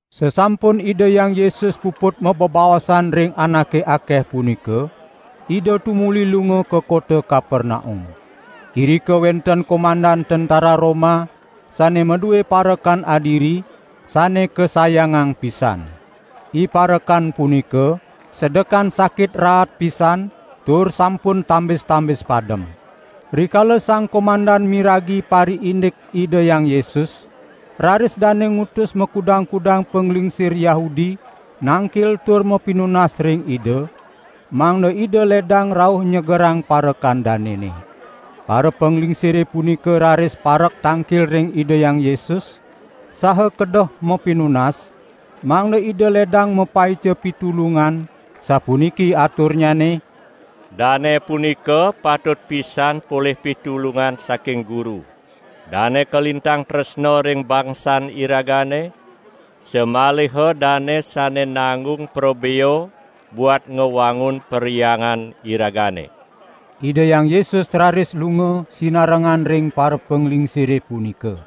Sasampun Ida Hyang Yesus puput mabebaosan ring anake akeh punika, Ida tumuli lunga ka kota Kapernaum. Irika wenten komandan tentera Roma sane madue parekan adiri, sane kasayangang pisan. Iparekan punika sedekan sakit raat pisan tur sampun tambis-tambis padem. Rikala sang komandan miragi pariindik Ida Hyang Yesus, raris dane ngutus makudang-kudang panglingsir Yahudi nangkil tur mapinunas ring Ida, mangda Ida ledang rauh nyegerang parekan danene. Parapanglingsire punika raris parek tangkil ring Ida Hyang Yesus, saha kedeh mapinunas, mangda Ida ledang mapaica pitulungan, sapuniki aturnyane: "Dane punika patut pisan polih pitulungan saking Guru. Dane kalintang tresna ring bangsan iragane, samaliha dane sane nanggung prabea buat ngwangun perhyangan iragane." Ida Hyang Yesus raris lunga sinarengan ring parapanglingsire punika.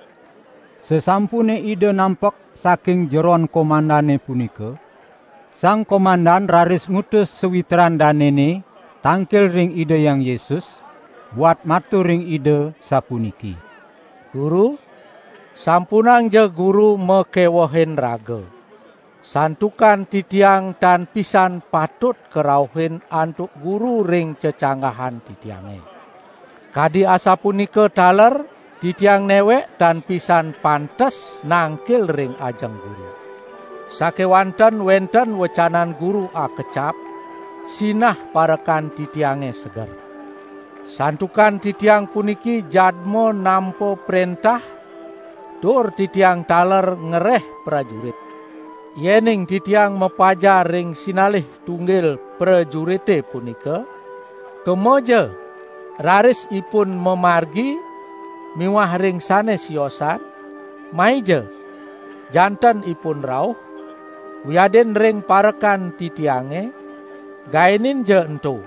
Sasampune Ida nampek saking jeron komandane punika, sang komandan raris ngutus sawitran danene tangkil ring Ida Hyang Yesus, buat matur ring Ida, sapuniki: "Guru, sampunangja Guru makewehin raga, santukan titiang tan pisan patut karauhin antuk Guru ring cecanggahan titiange, kadi asapunika taler titiang newek tan pisan pantes nangkil ring ajeng Guru. Sakewanten wenten wecanan Guru akecap, sinah parekan titiange seger. Santukan titiang puniki jadma nampa prentah, tur titiang taler ngereh prajurit; yening titiang mapajar ring sinalih tunggil prajurite punika: Kemaja, raris ipun mamargi miwah ring sane siosan: Maija, janten ipun rauh; wiadin ring parekan titiange: Gaeninja ento,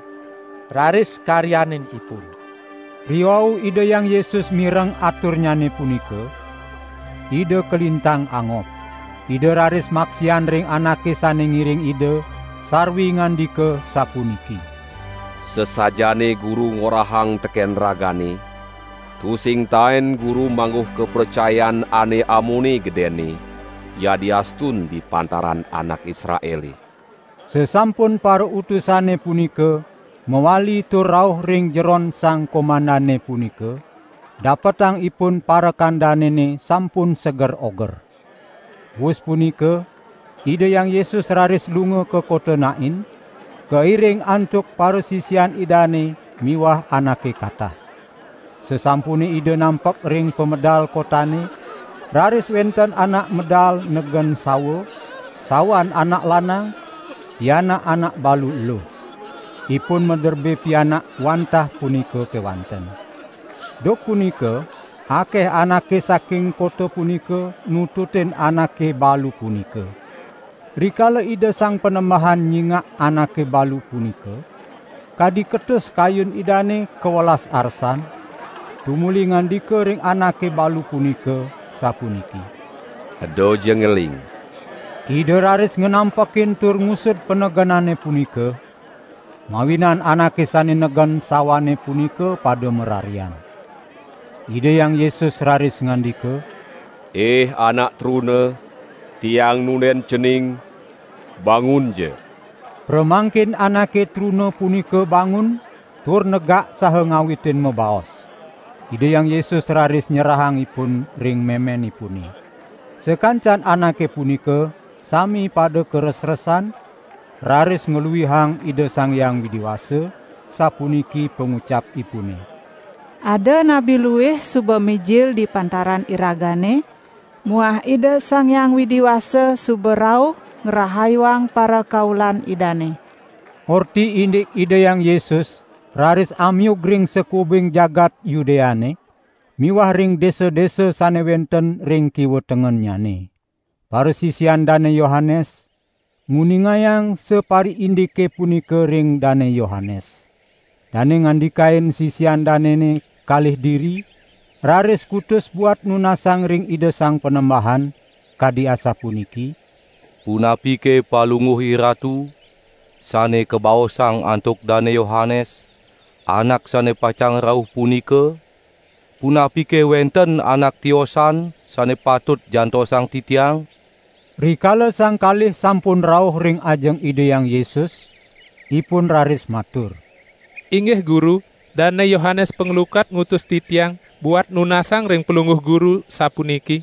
raris karyanin ipun." Riwau Ida Hyang Yesus mireng aturnyane punika, Ida kalintang angob. Ida raris maksian ring anake sane ngiring Ida, sarwi ngandika sapuniki: "Sasajaane Guru ngorahang teken ragane, tusing taen Guru mangguh kapracayan ane amone gedenne, yadiastun di pantaran anak Israele." Sasampun parautusane punika mawali tur rauh ring jeron sang komandane punika dapetang ipun parekan danene sampun seger oger. Wus punika Ida Hyang Yesus raris lunga ka kota Nain, kairing antuk parasisian Idane miwah anake katah. Sasampune Ida nampek ring pamedal kotane, raris wenten anak medal negen sawa, sawan anak lanang, pianak anak balu eluh. Ipun maderbe pianak wantah punika kewanten. Duk punika akeh anake saking kota punika nututin anake balu punika. Rikala Ida Sang Panembahan nyingak anake balu punika, kadi ketus kayun Idane kawelas arsan, tumuli ngandika ring anake balu punika, sapuniki: "Edaja ngeling!" Ida raris nganampekin tur ngusud panegenane punika, mawinan anake sane negen sawane punika pada mararian. Ida Hyang Yesus raris ngandika: "Ih anak truna, Tiang nunden cening, bangunja!" Pramangkin anake truna punika bangun tur negak saha ngawitin mabaos. Ida Hyang Yesus raris nyerahang ipun ring memenipune. Sakancan anake punika sami pada karesresan, raris ngluihang Ida Sang Hyang Widi Wasa, sapuniki pangucapipune: "Ada nabi luih suba mijil di pantaran iragane muah Ida Sang Hyang Widi Wasa suba rauh ngrahayuang parakaulan Idane." Orti indik Ida Hyang Yesus raris amiug ring sakuubing jagat Yudeane miwah ring desa-desa sane wenten ring kiwa tengennyane. Parasisian Dane Yohanes nguningang sapariindike punika ring Dane Yohanes. Dane ngandikain sisian danene kalih diri, raris kutus buat nunasang ring Ida Sang Panembahan, kadi asapuniki: "Punapike Palungguh IRatu, sane kabaosang antuk Dane Yohanes, anak sane pacang rauh punika? Punapike wenten anak tiosan sane patut jantosang titiang?" Rikala sang kalih sampun rauh ring ajeng Ida Hyang Yesus, ipun raris matur: "Inggih Guru, Dane Yohanes Panglukat ngutus titiang, buat nunasang ring Palungguh Guru, sapuniki: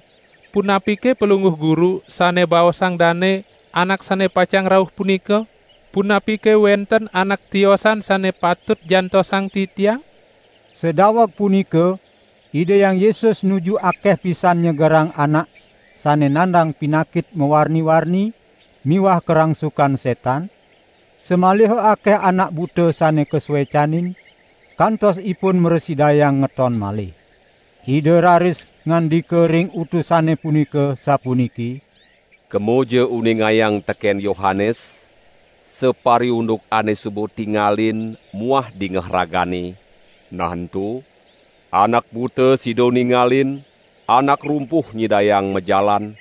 'Punapike Palungguh Guru, sane baosang dane, Anak sane pacang rauh punika? Punapike wenten anak tiosan sane patut jantosang titiang?' " Sadaweg punika Ida Hyang Yesus nuju akeh pisan nyegerang anak sane nandang pinakit mawarni-warni miwah karangsukan setan, samaliha akeh anak buta sane kasuecanin, kantos ipun mrasidayang ngeton malih. Ida raris ngandika ring utusane punika sapuniki: "Kemaja uningayang teken Yohanes, sapariunduk ane suba tingalin muah dingeh ragane, nah ento: Anak buta sida ningalin, anak rumpuh nyidayang majalan,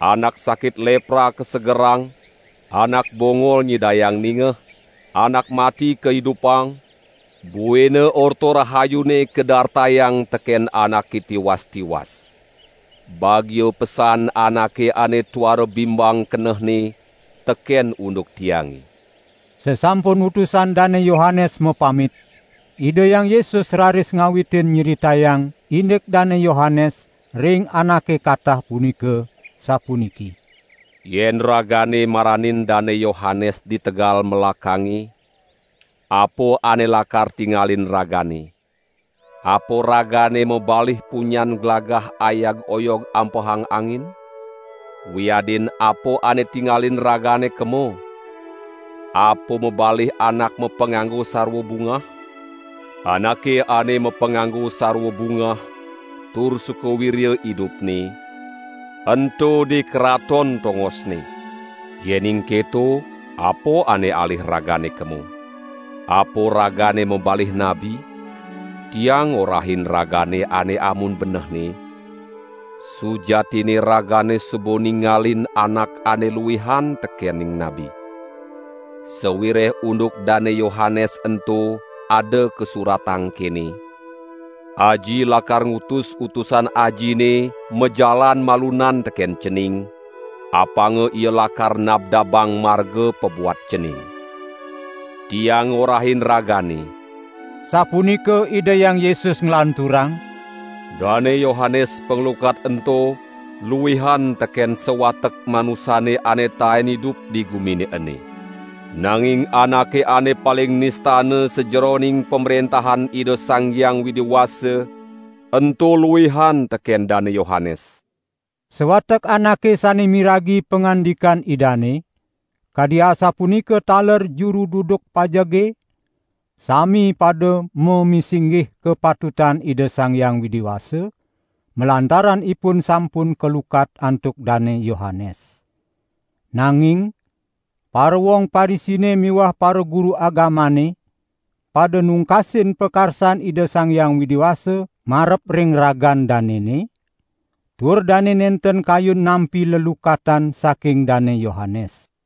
anak sakit lepra kasegerang, anak bongol nyidayang ningeh, anak mati kaidupang, buina Orta Rahayune kadartayang teken anake tiwas-tiwas. Bagia pesan anake ane tuara bimbang kenehne teken unduk Tiange." Sasampun utusan Dane Yohanes mapamit, Ida Hyang Yesus raris ngawitin nyritayang indik Dane Yohanes ring anake katah punika, sapuniki: "Yen ragane maranin Dane Yohanes di tegal melakange, apa ane lakar tingalin ragane? Apa ragane mabalih punyan glagah ayag-oyog ampehang angin? Wiadin apa ane tingalin ragane kema? Apa mabalih anak mapanganggo sarwa bungah? Anake ane mapanganggo sarwa bungah tur suka wirya idupne, ento di karaton tongosne. Yening keto apa ane alih ragane kema? Apa ragane mabalih nabi? Tiang ngorahin ragane ane amun benehne, sujatinne ragane suba ningalin anak ane luihan tekening nabi. Sawireh unduk Dane Yohanes ento ada kasuratang kene: 'Aji lakar ngutus utusan Ajine majalan malunan teken Cening, apanga ia lakar nabdabang marga pabuat Cening.' " "Tiang ngorahin ragane," sapunika Ida Hyang Yesus nglanturang, "Dane Yohanes Panglukat ento luihan teken sawatek manusane ane taen idup di gumine ene. Nanging anake ane paling nistana sajeroning Pamrentahan Ida Sang Hyang Widi Wasa, ento luihan teken Dane Yohanes." Sawatek anake sane miragi pangandikan Idane, kadi asapunika taler juru duduk pajege, sami pada mamisinggih kapatutan Ida Sang Hyang Widi Wasa, malantaran ipun sampun kalukat antuk Dane Yohanes. Nanging parawong Parisine miwah paraguru agamane pada nungkasin pakarsan Ida Sang Hyang Widi Wasa marep ring ragan danene, tur dane nenten kayun nampi lelukatan saking Dane Yohanes.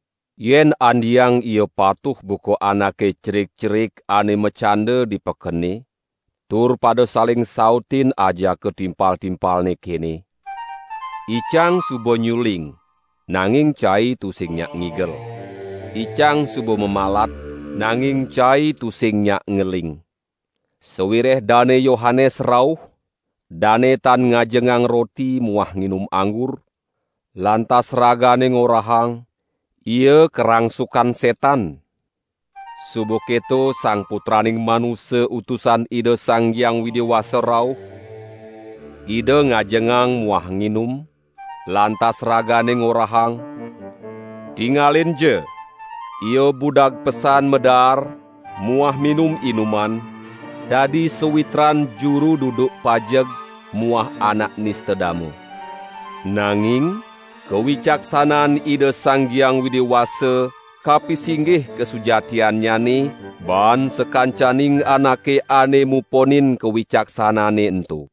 Yen andeang ia patuh buka anake cerik-cerik ane macanda di pekene, tur pada saling sautin ajaka timpal-timpalne kene: 'Icang suba nyuling nanging cai tusing nyak ngigel, icang suba mamalat nanging cai tusing nyak ngeling.' Sawireh Dane Yohanes rauh, dane tan ngajengang roti muah nginum anggur, lantas ragane ngorahang: 'Ia karangsukan setan!' Suba keto Sang Putraning Manusa Utusan Ida Sang Hyang Widi Wasa rauh, Ida ngajengang muah nginum, lantas ragane ngorahang: 'Tingalinja, Ia budag pesan madaar muah minum-inuman, dadi sawitran juru duduk pajeg muah anak nista dama.' Nanging kawicaksanaan Ida Sang Hyang Widi Wasa kapisinggih kasujatiannyane baan sakancaning anake ane muponin kawicaksanane ento."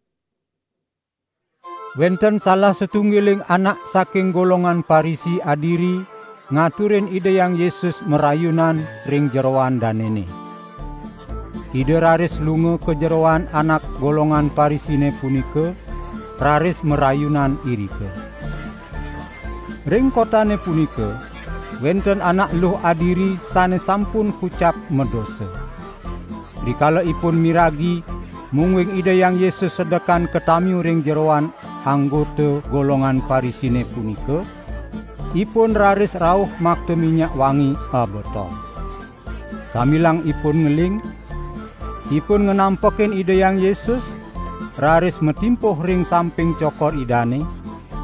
Wenten salah satunggiling anak saking golongan Parisi adiri ngaturin Ida Hyang Yesus marayunan ring jeroan danene. Ida raris lunga ka jeroan anak golongan Parisine punika, raris marayunan irika. Ring kotane punika wenten anak eluh adiri sane sampun kucap madosa. Rikala ipun miragi mungguing Ida Hyang Yesus sedekan katamiu ring jeroan anggota golongan Parisine punika, ipun raris rauh makta minyak wangi abotol. Sambilang ipun ngeling, ipun nganampekin Ida Hyang Yesus, raris matimpuh ring samping cokor Idane,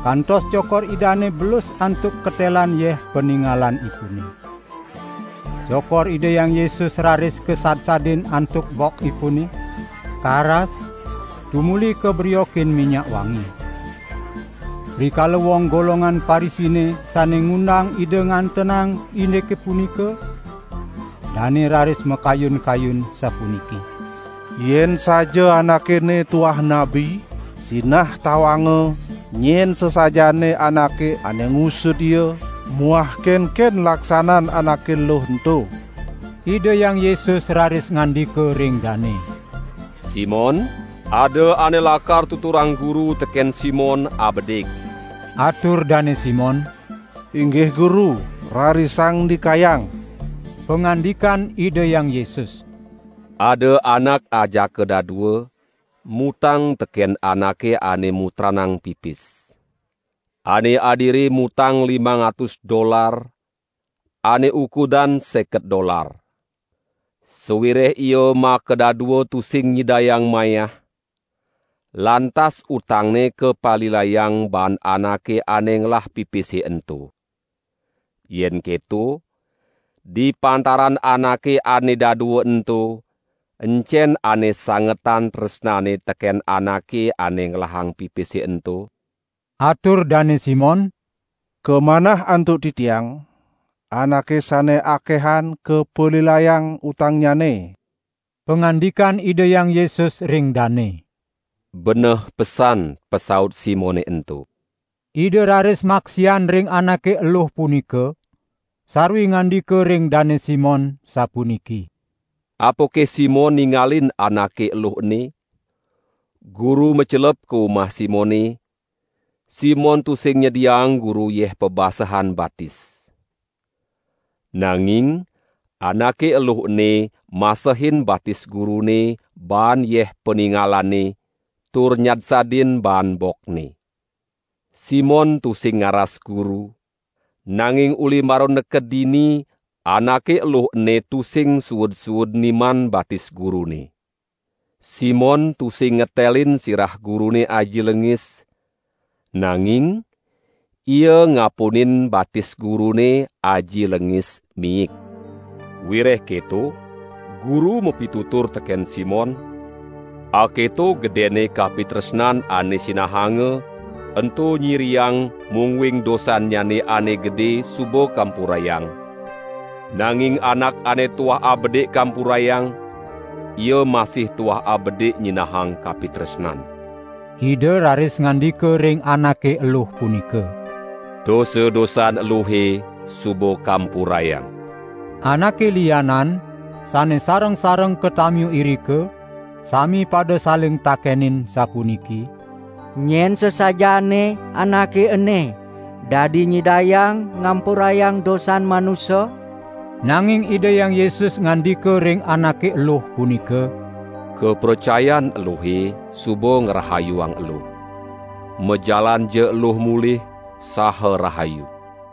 kantos cokor Idane belus antuk ketelan yeh paningalanipune. Cokor Ida Hyang Yesus raris kasadsadin antuk bokipune, karas, tumuli kabriokin minyak wangi. Rikala wong golongan Parisine sane ngundang Ida ngantenang indike punika, dane raris makayun-kayun, sapuniki: "Yen saja Anake ene tuah nabi, sinah tawanga nyen sasajaane anake ane ngusud Ia muah kenken laksanan anake eluh ento." Ida Hyang Yesus raris ngandika ring dane: "Simon, ada ane lakar tuturang Guru teken Simon abedik." Atur Dane Simon: "Inggih Guru, rarisang ndikayang." Pangandikan Ida Hyang Yesus: "Ada anak ajaka dadua mutang teken anake ane mutranang pipis. Ane adiri mutang limang atus dolar, ane ukudan seket dolar. Sawireh ia makadadua tusing nyidayang mayah, lantas utangne kapalilayang baan anake ane ngelah pipise ento. Yen keto, di pantaran anake ane dadua ento, encen ane sangetan tresnane teken anake ane ngelahang pipise ento?" Atur Dane Simon: "Kamanah antuk titiang, anake sane akehan kapalilayang utangnyane." Pangandikan Ida Hyang Yesus ring dane: "Beneh pesan pasaut Simone ento." Ida raris maksian ring anake eluh punika, sarwi ngandika ring Dane Simon, sapuniki: "Apake Simon ningalin anake eluh ene? Guru macelep ka umah Simone, Simon tusing nyediaang Guru yeh pabasehan batis. Nanging anake eluh ene masehin batis Gurune baan yeh paningalane tur nyadsadin baan bokne. Simon tusing ngaras Guru, nanging uli mara neked dini, anake eluh ene tusing suud-suud niman batis Gurune. Simon tusing ngetelin sirah Gurune aji lengis, nanging ia ngapunin batis Gurune aji lengis miik. Wireh keto Guru mapitutur teken Simon: Aketo gedenne kapitresnan ane sinahanga ento nyiriang mungguing dosannyane ane gede suba kampurayang. Nanging anak ane tuah abedik kampurayang, ia masih tuah abedik nyinahang kapitresnan." Ida raris ngandika ring anake eluh punika: "Dosa-dosan eluhe suba kampurayang." Anake lianan, sane sareng-sareng katamiu irika, sami pada saling takenin sapuniki: "Nyen sasajaane Anake ene, dadi nyidayang ngampurayang dosan manusa?" Nanging Ida Hyang Yesus ngandika ring anake eluh punika: "Kapracayan eluhe suba ngrahayuang eluh. Majalanja eluh mulih saha rahayu!"